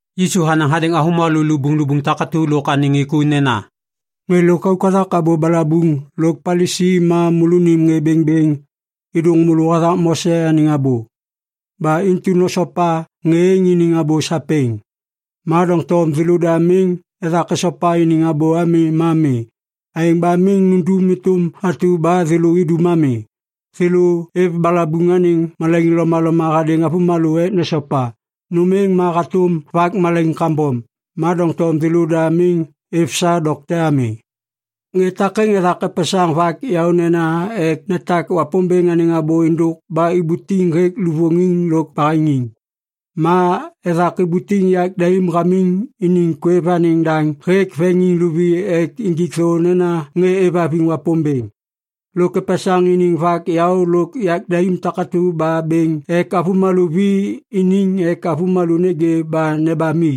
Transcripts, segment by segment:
Yisu hanaŋ hadêŋ avômalô lubuŋlubuŋ takatu lôk anêŋ ŋê ku nena, “Ŋê lôkauk hathak abô balabuŋ lôk Palisi ma môlônim ŋê bêŋbêŋ êdôŋ môlô hathak Mose anêŋ abô. Ba intu nosopa ŋê êŋ iniŋ abô sapêŋ. Ma doŋtom thêlôda miŋ ethak esopa iniŋ abô ami ma mi. Aêŋ ba miŋ nundum êtôm atu ba thêlô idum ami. Thêlô êv balabuŋ anêŋ malaiŋ lomaloma hadêŋ avômalô ek nesopa. Nôm êŋ ma hatôm vak malaiŋ kambom. Ma doŋtom thêlôda miŋ êv sa dokte ami. “Ŋê takêŋ ethak epesaŋ vak yaônena ek netak Wapômbêŋ anêŋ abô êndôk ba ibutiŋ hêk luvôŋiŋ lôk baheŋiŋ. Ma ethak ibutiŋ yak daim hamiŋ iniŋ kwêv anêŋ daŋ hêk veŋiŋ luvi ek injik thô nena ŋê êvhaviŋ Wapômbêŋ. Lôk epesaŋ iniŋ vak yaô lôk yak daim takatu ba bêŋ ek avômalô vi iniŋ ek avômalô nêgê ba nebam i.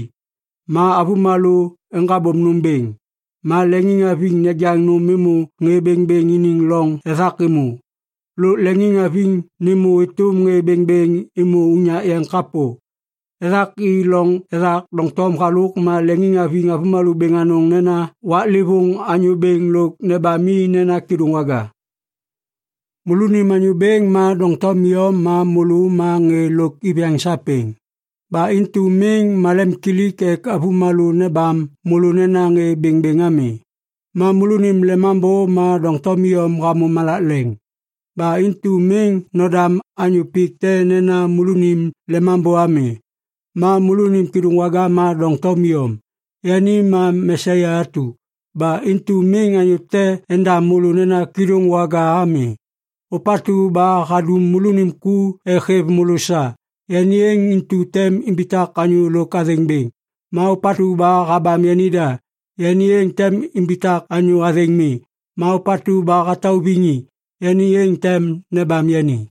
Ma avômalô eŋgabôm nôm bêŋ, ma leŋiŋhaviŋ nejaŋ nôm êmô ŋê bêŋbêŋ iniŋ loŋ ethak êmô. Lôk leŋiŋhaviŋ nêmô êtôm ŋê bêŋbêŋ êmô unyak yeŋ kapô. Ethak i loŋ ethak doŋtom halôk ma leŋiŋhaviŋ avômalô bêŋ anôŋ nenaŋ nena, ‘Waklêvôŋ anyô bêŋ’ lôk nebam i nena ‘Kêdôŋwaga’. “Môlônim Anyô Bêŋ ma doŋtom iyom ma môlô ma ŋê lôk iviyaŋ sapêŋ. Ba intu miŋ malemimkilik ek avômalô nebam môlô nena ŋê bêŋbêŋ ami. Ma môlônim lemambô ma doŋtom iyom hamô malak leŋ. Ba intu miŋ nodam anyô pik te nena môlônim lemambô ami. Ma môlônim kêdôŋwaga ma doŋtom iyom. Yani ma Mesia atu. Ba intu miŋ anyô te endam môlô nena ‘kêdôŋwaga’ ami. Ôpatu ba hadum môlônim ku ek hêv môlô sa, yani êŋ intu tem imbitak anyô lôk athêŋ bêŋ. Ma ôpatu ba habam yanida, yani êŋ tem imbitak anyô athêŋ mi. Ma ôpatu ba hatauviŋ i, yani êŋ tem nebam yani.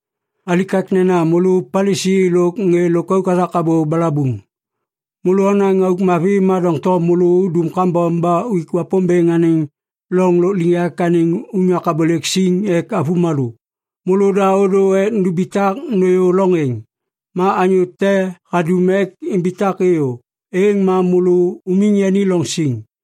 “Alikaknena môlô Palisi lôk ŋê lôkauk hathak abô balabuŋ! Môlô onaŋ auk mavi ma doŋtom môlô udum kambom ba uik Wapômbêŋ anêŋ loŋ lôkliŋyak anêŋ unyak abôlêk siŋ ek avômalô. Môlôda ôdô ek numbitak nôyô loŋ êŋ. Ma anyô te hadum ek imbitak êyô, êŋ ma môlô umiŋ yani loŋ siŋ.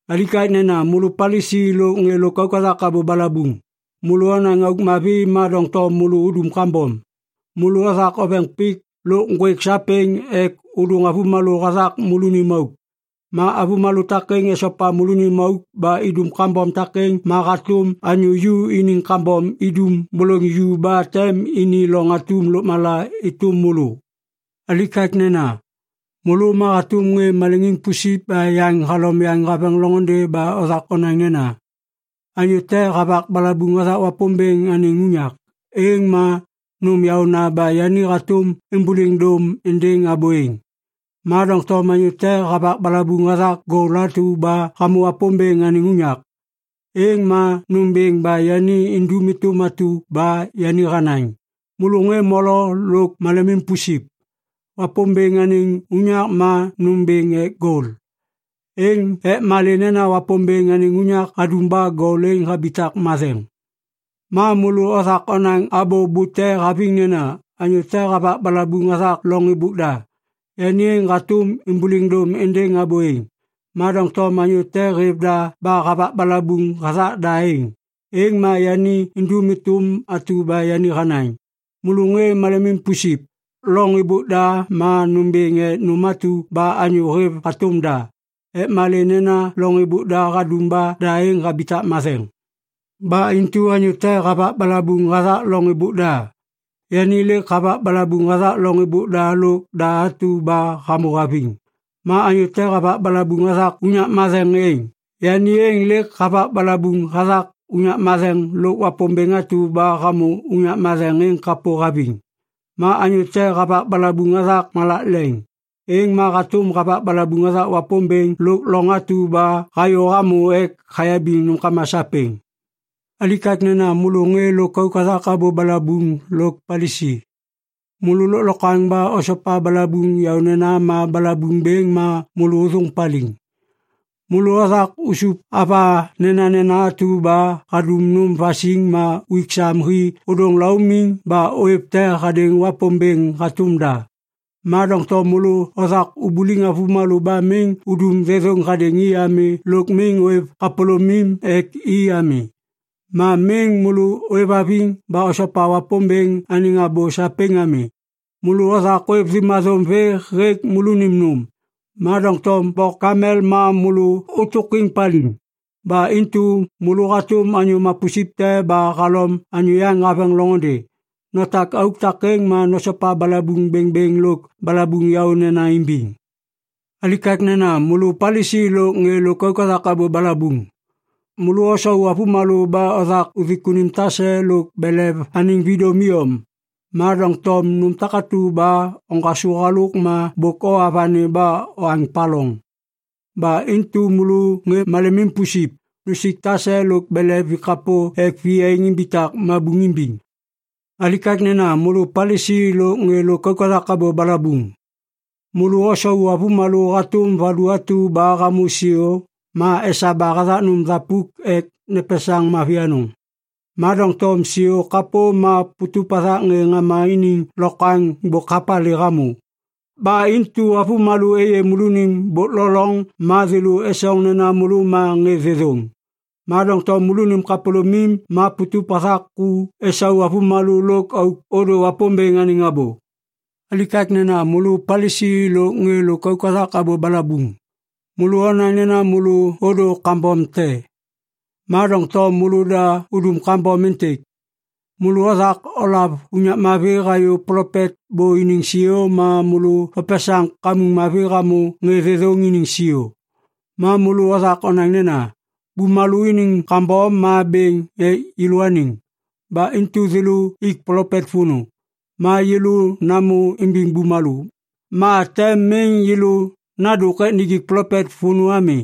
“Alikaknena môlô Palisi lôk ŋê lôkauk hathak abô balabuŋ! Môlô onaŋ auk mavi ma doŋtom môlô udum kambom. Môlô othak oveŋ pik lôk ŋgwêk sapêŋ ek ôdôŋ avômalô hathak môlônim auk. Ma avômalô takêŋ esopa môlônim auk ba idum kambom takêŋ ma hatôm anyô ju iniŋ kambom idum bôlôŋ ju ba tem ini loŋ atum lôkmala êtôm môlô. “Alikaknena! Môlô ma hatôm ŋê maleŋiŋ pusip ba yaŋ halom yaŋ haveŋ loŋôndê ba othak onaŋ nena, ‘Anyô te havak balabuŋ hathak Wapômbêŋ anêŋ unyak, êŋ ma nôm yaôna ba yani hatôm êmbôliŋ dôm êndêŋ abô êŋ. Ma doŋtom anyô te havak balabuŋ hathak gol atu ba hamô Wapômbêŋ anêŋ unyak, êŋ ma nômbêŋ ba yani indum êtôm atu ba yani hanaŋ.’ Môlô ŋê molo lôk malemim pusip! Wapômbêŋ anêŋ unyak ma nômbêŋ ek gol. Ek malê nena Wapômbêŋ anêŋ unyak hadum ba gol êŋ habitak matheŋ. “Ma môlô othak onaŋ abô bute haviŋ nena, ‘Anyô te havak balabuŋ hathak loŋ êbôk da, yani êŋ hatôm êmbôliŋ dôm êndêŋ abô êŋ. Ma doŋtom anyô te hêv da ba havak balabuŋ hathak da êŋ, êŋ ma yani indum êtôm atu ba yani hanaŋ.’ Môlô ŋê malemim pusip! Loŋ êbôk da ma nômbêŋ ek nôm atu ba anyô hêv hatôm da. Ek malê nena loŋ êbôk da hadum ba da êŋ habitak matheŋ. “Ba intu Anyô te havak balabuŋ hathak loŋ êbôk da, yani lêk havak balabuŋ hathak loŋ êbôk da lôk da atu ba hamô haviŋ. Ma anyô te havak balabuŋ hathak unyak matheŋ êŋ, yani êŋ lêk havak balabuŋ hathak unyak matheŋ lôk Wapômbêŋ atu ba hamô unyak matheŋ êŋ kapô haviŋ. Ma anyô te havak balabuŋ hathak malak leŋ, êŋ ma hatôm havak balabuŋ hathak Wapômbêŋ lôk loŋ atu ba hayô hamô ek hayabiŋ nômkama sapêŋ. “Alikaknena môlô ŋê lôkauk hathak abô balabuŋ lôk Palisi! Môlô lôklokwaŋ ba osopa balabuŋ yaônena ma balabuŋ bêŋ ma môlô ôthôŋ paliŋ. Môlô othak usup ava nenanena atu ba hadum nôm vasiŋ ma uik sam hi ôdôŋ laumiŋ ba ôêv te hadêŋ Wapômbêŋ hatôm da. Ma doŋtom môlô othak ubuliŋ avômalô ba miŋ udum thêthôŋ hadêŋ i ami lôk miŋ ôêv kapôlômim ek i ami. Ma miŋ môlô ôêvhaviŋ ba osopa Wapômbêŋ anêŋ abô sapêŋ ami. “Môlô othak ôêv thêmathôm vê hêk môlônim nôm, ma doŋtom bok kamel ma môlô ôtôkwêŋ paliŋ! Ba intu môlô hatôm anyô mapusip te ba halom anyô yaŋ haveŋ loŋôndê. Notak auk takêŋ ma nosopa balabuŋ bêŋbêŋ lôk balabuŋ yaônena imbiŋ. “Alikaknena môlô Palisi lôk ŋê lôkauk hathak abô balabuŋ! Môlô osau avômalô ba othak uthik unim tase lôk belev anêŋ vidôm iyom. Ma doŋtom nôm takatu ba oŋgasô halôk ma bôk owa vani ba oaŋ paloŋ. Ba intu môlô ŋê malemim pusip! Nusik tase lôk belev vi kapô ek viyaiŋ imbitak mabuŋ imbiŋ! “Alikaknena môlô Palisi lôk ŋê lôkauk hathak abô balabuŋ! Môlô osau avômalô hatôm valu atu ba hamô siô ma esaba hathak nôm thapuk ek nepesaŋ mavi anôŋ. Ma doŋtom siô kapô ma putup hathak ŋê ŋama iniŋ lokwaŋ bôk hapalê hamô. Ba intu avômalô êyê môlônim bôk lo loŋ ma thêlô esoŋ nena môlô ma ŋê thêthôŋ. Ma doŋtom môlônim kapôlômim ma putup hathak ku esau avômalô lôk auk ôdô Wapômbêŋ anêŋ abô. “Alikaknena môlô Palisi lôk ŋê lôkauk hathak abô balabuŋ! Môlô onaŋ nena môlô ôdô kambom te. Ma doŋtom môlôda udum kambom êntêk. Môlô othak olav unyak mavi hayô plopet bô iniŋ siô ma môlô opesaŋ kamuŋ mavi hamô ŋê thêthôŋ iniŋ siô. Ma môlô othak onaŋ nena, ‘Bumalô iniŋ kambom ma bêŋ ek yêlôaniŋ. Ba intu thêlô ik plopet vônô. Ma yêlô namô imbiŋ bumalô, ma tem miŋ yêlô nadôk ek nijik plopet vônô ami.’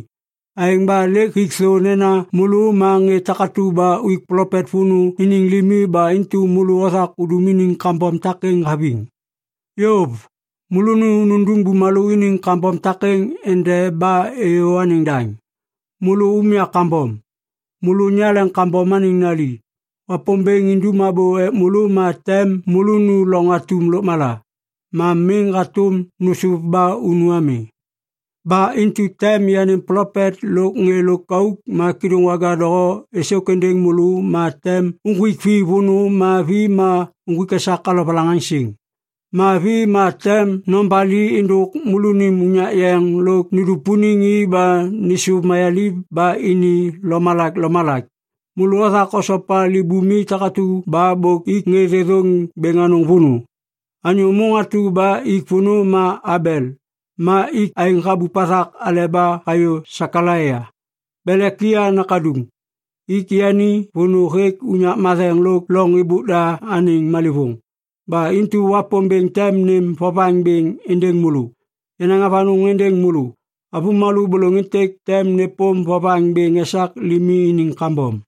Aêŋ ba lêk hik thô nena môlô ma ŋê takatu ba uik plopet vônô iniŋ limi ba intu môlô othak udum iniŋ kambom takêŋ haviŋ. Yôv! Môlônu nundum bumalô iniŋ kambom takêŋ endeba êyô anêŋ daŋ! “Môlô umya kambom! Môlô nyaleŋ kambom anêŋ nali! Wapômbêŋ indum abô ek môlô ma tem môlônu loŋ atum lôkmala. Ma miŋ hatôm nôsôv ba unu ami. “Ba intu tem yanêm plopet lôk ŋê lôkauk ma kêdôŋwaga doho êsôk êndêŋ môlô ma tem uŋgwik vi vônô ma vi ma uŋgwik esak alovalaŋaŋsiŋ. Ma vi ma tem nobali êndôk môlônim unyak yeŋ lôk nudupuniŋ i ba nêsôv mayaliv ba ini lomalak lomalak. Môlô othak osopa libumi takatu ba bôk ik ŋê thêthôŋ bêŋ anôŋ vônô. Anyô môŋ atu ba ik vônô ma Abel ma ik aêŋ habup hathak aleba hayô Sekalaia, Belekia nakaduŋ. Ik yani vônô hêk unyak matheŋ lôk loŋ êbôk da anêŋ malêvôŋ. Ba intu Wapômbêŋ tem nêm vovaŋ bêŋ êndêŋ môlô. Yanaŋ avanôŋ êndêŋ môlô! Avômalô bôlôŋ êntêk tem nêpôm vovaŋ bêŋ esak limi iniŋ kambom.”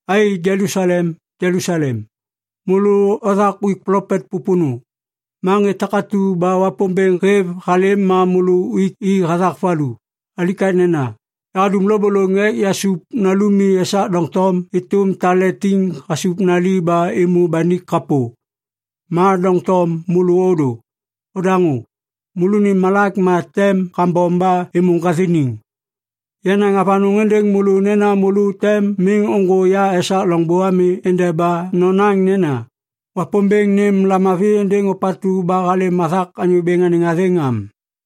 “Ai, Jelusalem, Jelusalem! Môlô othak uik plopet pôpônô! Ma ŋê takatu ba Wapômbêŋ hêv halêm ma môlô uik i hathak valu! Alikaknena! Yahadum lôbôlôŋ ek yasup nalumi esak doŋtom êtôm tale tiŋ hasup nali ba êmô banik kapô. Ma doŋtom môlô ôdô. Odaŋô! Môlônim malak ma tem kambom ba êmô ŋgathiniŋ! Yanaŋ avanôŋ êndêŋ môlô nena môlô tem miŋ ôŋgô ya esak loŋbô ami endeba nonaŋ nena, ‘Wapômbêŋ nêm lamavi êndêŋ ôpatu ba halêm hathak Anyô Bêŋ anêŋ athêŋ!’ am.”